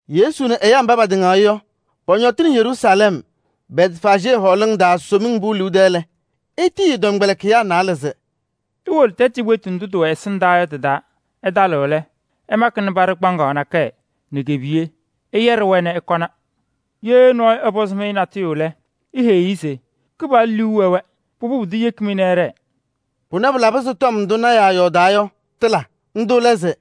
Yesu nɛ ɛyaa mba patɩŋaɣ-ɩ yɔ, pɔñɔtɩnɩ Yeruusalɛm Bɛtfaajee hɔɔlʋʋ taa Somiŋ Pʋʋ liu tɛɛ lɛ, etiyi ɛ-tɔmkpɛlɩkɩyaa naalɛ se: “Iwolo tɛtʋ cikpetu ndʋ tɩwɛ ɛsɩndaa yɔ tɩ-taa. Ɩtalɩɣ lɛ, ɩmakɩnɩ paɖɩ kpaŋaɣ nakɛyɛ nɛ ke-piye. Ɩyɛɖɩ-wɛ nɛ ɩkɔna. Ye nɔɔyʋ ɛpɔzɩ-mɩ natʋyʋ lɛ, iheyi-i se: ‘Kɩpaɣlʋ liu wɛ-wɛ.’ Pʋbʋ, pʋdʋ yeki-mɩ nɛ ɩɖɛɛ.” Pʋnɛ pɩlabɩ se tɔm ndʋ lɔɔyaɣ tʋ yɔɔdaa yɔ, tɩla. Ndʋ lɛ se: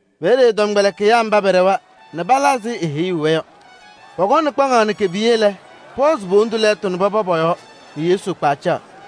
Peeye ɛ-tɔmkpɛlɩkɩyaa mba pɛɖɛwa nɛ pala ɛzɩ eheyuu-wɛ yɔ. Pɔkɔnɩ kpaŋaɣ nɛ ke-piye lɛ, pɔhɔzɩ po-wondu lɛɛtʋ nɛ pɔpɔ pɔ-yɔɔ nɛ Yesu kpa ɛcaɣ.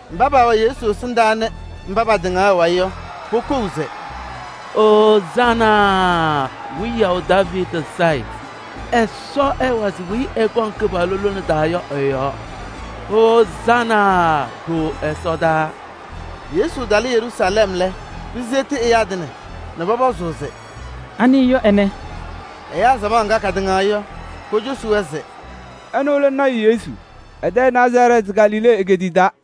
Mba paawɛ Yesu ɛsɩndaa nɛ mba patɩŋaɣ ɛ-wayɩ yɔ, pokou se: “Ozaana! Wiyaʋ Daaviidi Sayɩ! Ɛsɔ ɛwazɩ weyi ɛkɔŋ Kɩpaɣlʋ lone taa yɔ ɛ-yɔɔ. Ozaana! Ɖooo ɛsɔdaa!” Yesu talɩ Yeruusalɛm lɛ, piseɣti ɛyaa tɩŋa nɛ pɔpɔzʋʋ se: “Anɩ yɔ ɛnɛ?” Ɛyaa samaɣ ŋga katɩŋaɣ-ɩ yɔ, kocosi-wɛ se: “Ɛnʋ lɛ lɔɔyaɣ tʋ Yesu, ɛ-tɛ Nazarɛɛtɩ Galilee egeetiye taa.”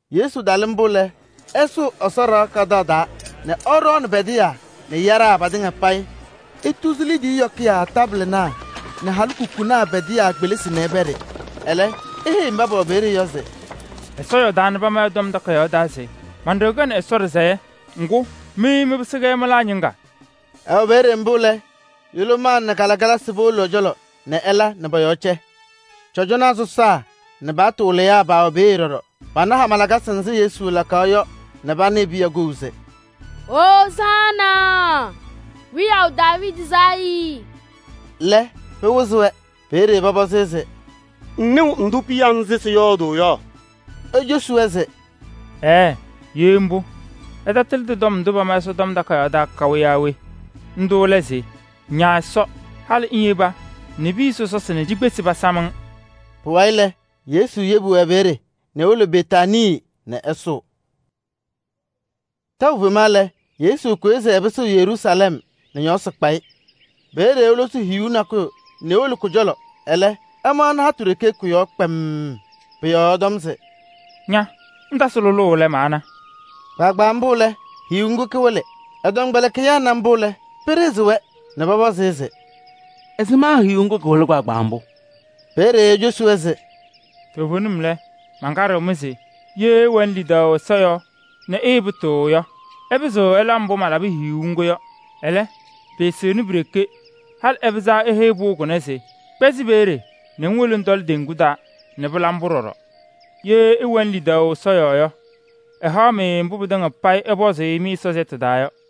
Yesu talɩ mbʋ lɛ, ɛsʋʋ Ɛsɔ ɖɩɣa kadaɣ taa nɛ ɛɖɔɔnɩ pɛdɩyaa nɛ yaɖaa patɩŋa payɩ. Etuzi liidiye yɔkɩyaa taabɩlɩnaa nɛ halikukunaa pɛdɩyaa kpelisi nɛ ɛpɛɖɩ. Ɛlɛ eheyi mba pɛwɛ peeye yɔ se: “Ɛsɔ yɔɔdaa nɛ pama ɛ-Tɔm Takayaɣ taa se: ‘Man-ɖɩɣa kɛɣnɩ Ɛsɔ ɖɩsɛyɛ.’ Ŋgʋ, mɩ mɩpɩsɩ-kɛ mɩlaa ñɩŋga.” Ɛwɛ peeye mbʋ lɛ, yʋlʋmaa nɛ kalɩkalasɩ powolo ɛ-cɔlɔ nɛ ɛla nɛ pɔ-yɔɔ cɛ. Cɔjɔnaa sɔsaa nɛ paɣtʋ wɩlɩyaa paawɛ peeye ɖɔɖɔ. Pana hama lakasɩ nzɩ Yesu lakaɣ yɔ nɛ panɩɩ piya kou se: “Ozaana! Wiyaʋ Daaviidi Sayɩ” lɛ, pɩwɩzɩ-wɛ. Peeye pɔpɔzɩ-ɩ se: “Ŋnɩɣ ndʋ piya nzɩ sɩyɔɔdʋʋ yɔ?” Ecosi-wɛ se: “Ɛɛɛ! Ye mbʋ ɩtakalɩdɩ tɔm ndʋ pama Ɛsɔtɔm Takayaɣ taa yɔ kaʋ? Ndʋ lɛ se: ‘Ña Ɛsɔ, halɩ ŋyeba nɛ piya sɔsɔsɩ nɛ cikpesi pasam-ŋ.’” Pʋwayɩ lɛ, Yesu yebi-wɛ peeye nɛ ewolo Betaanii nɛ ɛsʋʋ. Tɛʋ fema lɛ, Yesu kʋyɩ se ɛpɩsɩɣ Yeruusalɛm nɛ ñɔɔsɩ kpa-ɩ. Peeye elosi hiyuu nakʋyʋ nɛ ewolo kʋ-cɔlɔ, ɛlɛ, ɛmaɣnɩ hatʋ ɖeke kʋ-yɔɔ kpemm. Pʋ-yɔɔ ɛtɔm se: “Ña! Ŋtasɩ lʋlʋʋ lɛ, maana!” Kpaagbaa mbʋ lɛ, hiyuu ŋgʋ kɩwɩlɩ. Ɛ-tɔmkpɛlɩkɩyaa na mbʋ lɛ, pɩɖɩɣzɩ-wɛ nɛ pɔpɔzɩ-ɩ se: “Ɛzɩma hiyuu ŋgʋ kɩwɩlɩ kpaagbaa mbʋ?” Peeye ecosi-wɛ se: “Toovenim lɛ, mankaɖɩɣ-mɩ se ye ɩwɛnɩ lidaʋ Ɛsɔ yɔɔ nɛ ɩɩpʋtʋʋ yɔ, ɩpɩzɩɣ ɩla mbʋ malabɩ hiyuu ŋgʋ yɔ. Ɛlɛ, pɩɩsɩɣnɩ pi-ɖeke, halɩ ɩpɩzaɣ se iheyi pʋʋ kʋnɛ se: ‘Kpɛzɩ peeye nɛ ŋwolo ŋtɔlɩ teŋgu taa’ nɛ pɩla mbʋ ɖɔɖɔ. Ye ɩwɛnɩ lidaʋ Ɛsɔ yɔɔ yɔ, ɛhaɣ-mɩ mbʋ pɩtɩŋa payɩ ɩpɔzʋʋ-ɩ mɩ-Ɛsɔ sɛʋ taa yɔ.”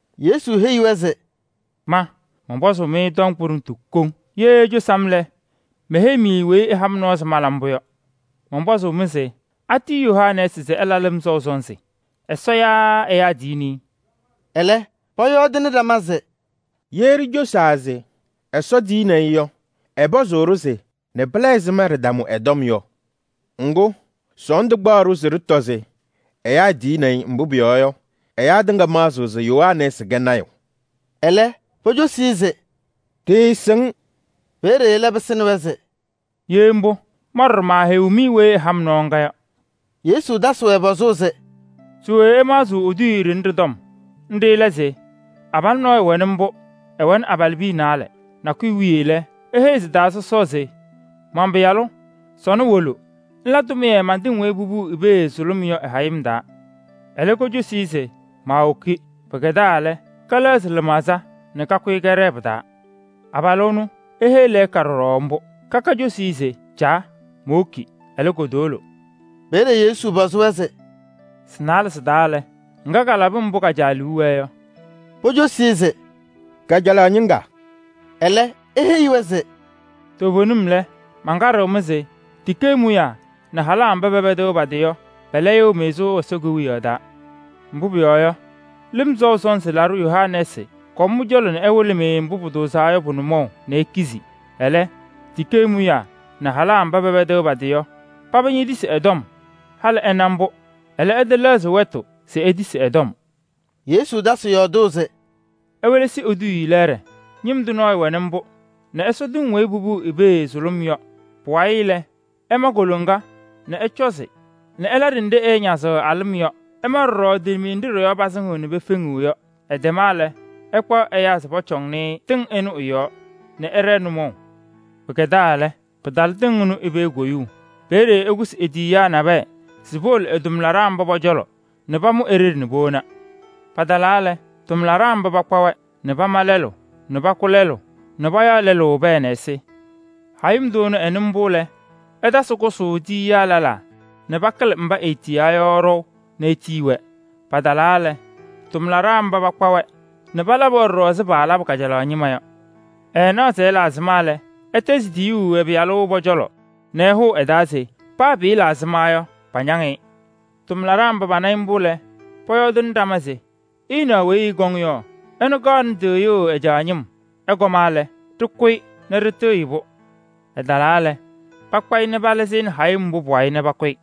Yesu heyi-wɛ se: “Ma mɔnpɔzʋʋ-mɩ tɔm kʋɖʋmtʋ koŋ, ye icosi-m lɛ, meheyi-mɩ weyi ɛha-m nɔɔ se mala mbʋ yɔ. Mɔnpɔzʋʋ-mɩ se: atiyi Yohanɛɛsɩ se ɛla ɛyaa lɩm sɔʋ sɔnzɩ? Ɛsɔ yaa ɛyaa tiyini-i?” Ɛlɛ, pɔyɔɔdɩnɩ ɖama se: “Ye ɖicosaa se: ‘Ɛsɔ tiyini-i’ yɔ, ɛpɔzʋʋ-ɖʋ se: ‘Nɛ pɩla ɛzɩma ɖɩtamʋ ɛ-tɔm yɔ?’ Ŋgʋ, sɔɔndʋ kpaɣ-ɖʋ se ɖɩtɔ se: ‘Ɛyaa tiyini-i,’ mbʋ pʋyɔɔ yɔ, ɛyaa tɩŋa maɣzɩɣ se Yohanɛɛsɩ kɛ lɔɔyaɣ tʋ.” Ɛlɛ pocosi-i se: “Ɖɩɩsɩŋ.” Peeye ɛlɛ pɩsɩnɩ-wɛ se: “Ye mbʋ, ma ɖɔɖɔ maaheyiɣ-mɩ weyi ɛha-m nɔɔ ŋga yɔ.” Yesu tasɩ-wɛ pɔzʋʋ se: “Se we ɩmaɣzɩɣ eduuye ɖɩnɛ ɖɩ-tɔm? Nɖɩ lɛ se: abalʋ nɔɔyʋ wɛnɩ mbʋ, ɛwɛnɩ abalɩbiya naalɛ. Nakʋyʋ wiye lɛ, eheyi sɩ-taa sɔsɔɔ se: ‘Man-pɩyalʋ! Sɔnɔ wolo ŋla tʋmɩyɛ man-tɩŋ weyi popuu i-pee sʋlʋm yɔ ɩ-hayɩm taa.’ Ɛlɛ kocosi-i se: ‘Maawoki.’ Pɩkɛdaa lɛ, kɛlɛɣzɩ lɩmaɣza nɛ kakʋyɩ kɛɖɛɛ pɩ-taa. Abalʋ ɛnʋ eheyi lɛɛka ɖɔɖɔ mbʋ. Kaka cosi-i se: ‘Caa, mowoki.’ Ɛlɛ, kotowolo.” Peeye Yesu pɔzɩ-wɛ se: “Sɩ-naalɛ sɩ-taa lɛ, ŋga kalabɩ mbʋ ka-caa liu wɛɛ yɔ?” Pocosi-i se: “Kajalaɣ ñɩŋga.” Ɛlɛ eheyi-wɛ se: “Toovenim lɛ, mankaɖɩɣ-mɩ se tikee mʋyaa nɛ halaa mba pɛpɛdɩɣ pa-tɩ yɔ, pɛlɛyɩɣ-mɩ sʋʋ Ɛsɔ Kewiyaɣ taa. Mbʋ pʋyɔɔ yɔ, Lɩm Sɔʋ Sɔnzɩ Laɖʋ Yohanɛɛsɩ kɔm mɩ-cɔlɔ nɛ ɛwɩlɩ-mɩ mbʋ pʋtʋʋzaa yɔ pʋ-nʋmɔʋ nɛ ikizi. Ɛlɛ, tikee mʋyaa nɛ halaa mba pɛpɛdɩɣ pa-tɩ yɔ, paba ñetisi ɛ-tɔm. Halɩ ɩna mbʋ, ɛlɛ ɩtɛlɛɣzɩ wɛtʋ se itisi ɛ-tɔm.” Yesu tasɩ yɔɔdʋʋ se: “Iwelesi eduuye lɛɛɖɛ: ñɩm tʋ nɔɔyʋ wɛnɩ mbʋ nɛ ɛsɔ tɩŋ weyi popuu i-pee sʋlʋm yɔ. Pʋwayɩ lɛ, ɛma koloŋa nɛ ɛcɔzɩ nɛ ɛla ɖenɖe ɛɛñazɩɣ a-lɩm yɔ. Ɛma ɖɔɖɔ tilimiye nɖɩ ɖɩ-yɔɔ pasɩŋɩɣ nɛ pefeŋiɣ yɔ. Ɛtɛma lɛ, ɛkpaɣ ɛyaa se pɔcɔŋnɩ tɩŋ ɩnʋ ɩ-yɔɔ nɛ ɛɖɛɛ nʋmɔʋ. Pɩkɛdaa lɛ, pɩtalɩ tɩŋ ɩnʋ i-pee koyuu. Peeye ɛkʋsɩ e-tiyiyaa nabɛyɛ se powolo ɛ-tʋmlaɖaa mba pɔ-cɔlɔ nɛ pamʋ e-ɖeɖe nɛ powona. Patalaa lɛ, tʋmlaɖaa mba pakpa-wɛ nɛ pama lɛlʋ nɛ pakʋ lɛlʋ nɛ payaɣ lɛlʋ pɛɛ nɛ ɛsɩ. Hayɩm tʋ ɛnʋ ɛnɩ mbʋ lɛ, ɛtasɩ kʋsʋʋ tiyiyaa lɛlaa nɛ pakɩlɩ mba eetiyaa yɔ ɖɔʋ nɛ etiyi-wɛ. Patalaa lɛ, tʋmlaɖaa mba pakpa-wɛ nɛ palabɩ-wɛ ɖɔɖɔ ɛzɩ paalabʋ kajalaɣ ñɩma yɔ. Ɛɛnaɣ se ɛla ɛzɩma lɛ, ɛtɛzɩ tiyuu ɛ-pɩyalʋ pɔ-cɔlɔ nɛ ɛhʋʋ ɛ-taa se: ‘Paa pɩɩla ɛzɩma, pañaŋ-ɩ.’ Tʋmlaɖaa mba pana-ɩ mbʋ lɛ, pɔyɔɔdɩnɩ ɖama se: ‘Ɩnaɣ weyi ɛkɔŋ yɔ, ɛnʋ kaɣnɩ tɩɣyʋʋ ɛ-caa ñɩm. Ɛkɔma lɛ, ɖɩkʋ-ɩ nɛ ɖɩtɩɣyɩ-pʋ!’ Ɛtalaa lɛ, pakpa-ɩ nɛ palɩzɩ-ɩ nɛ hayɩm mbʋ pʋ-wayɩ nɛ pakʋ-ɩ.”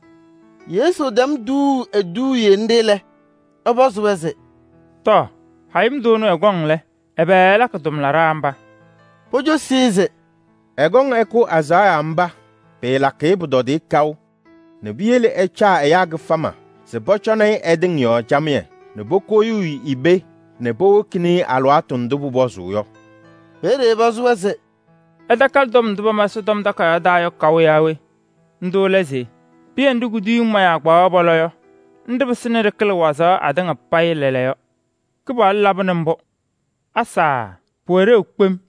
Yesu tɛm tuuu eduuye nɖɩ lɛ, ɛpɔzɩ-wɛ se: “Tɔɔ! Hayɩm tʋ ɛnʋ ɛkɔŋ lɛ, ɛbɛ ɛlakɩ tʋmlaɖaa mba?” Pocosi-i se: “Ɛkɔŋ ɛkʋ azaɣa mba, pɩɩlakɩ-ɩ pʋtɔdɩyɛ kaʋ nɛ piyele ɛcaa ɛyaa kɩfama se pɔcɔnɩ-ɩ ɛ-tɩŋ yɔɔ camɩyɛ nɛ pokoyuu i-pee nɛ powokini-i alɩwaatʋ ndʋ pʋpɔzʋʋ yɔ.” Peeye ɛpɔzɩ-wɛ se: “Ɩtakalɩ tɔm ndʋ pama Ɛsɔtɔm Takayaɣ taa yɔ kaʋ yaa we? Ndʋ lɛ se: ‘Pɩyɛ nɖɩ kuduyiŋ mayaa kpaɣaɣ pɔlɔ yɔ, nɖɩ pɩsɩnɩ ɖɩkɩlɩ wazaɣ atɩŋa payɩ lɛɛlɛɛyɔ. Mbʋ Kɩpaɣlʋ laba nɛ ɖɩnaɣ nɛ pɩɖɩɣzɩɣ-ɖʋ kpem!’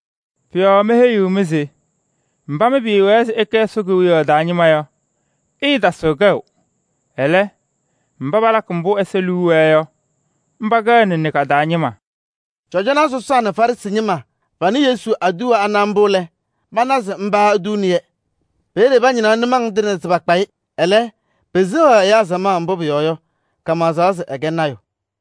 Pʋ-yɔɔ meheyiɣ-mɩ se: mba mɩ pɩɩwɛɛ se ɩkɛ Ɛsɔ Kewiyaɣ taa ñɩma yɔ, ɩɩtasɩɣ kɛʋ. Ɛlɛ, mba palakɩ mbʋ Ɛsɔ liu wɛɛ yɔ pɛkɛɣnɩ ka-taa ñɩma. [ Ye pɩcɩbɩ nɔɔyʋ nɛ ɛtɔlɩ pɩyɛ nɖɩ ɖɩ-yɔɔ yɔ, ɛmɩzɩɣ kpɛdɛɛɛ. Ye pɛcɩbɩ nɔɔyʋ nɛ ɖɩtɔlɩ ɛ-yɔɔ yɔ, ɖɩnaŋɩɣ-ɩ naŋa naŋa.]” Cɔjɔnaa sɔsaa nɛ Farɩsɩ ñɩma panɩ Yesu aduwa ana mbʋ lɛ, pana se mba etuuni-yɛ. Peeye pañɩnaɣ nʋmɔŋ tɩŋa se pakpa-ɩ. Ɛlɛ, peseɣaɣ ɛyaa samaɣ, mbʋ pʋyɔɔ yɔ, kamaɣzaɣ se ɛkɛ lɔɔyaɣ tʋ.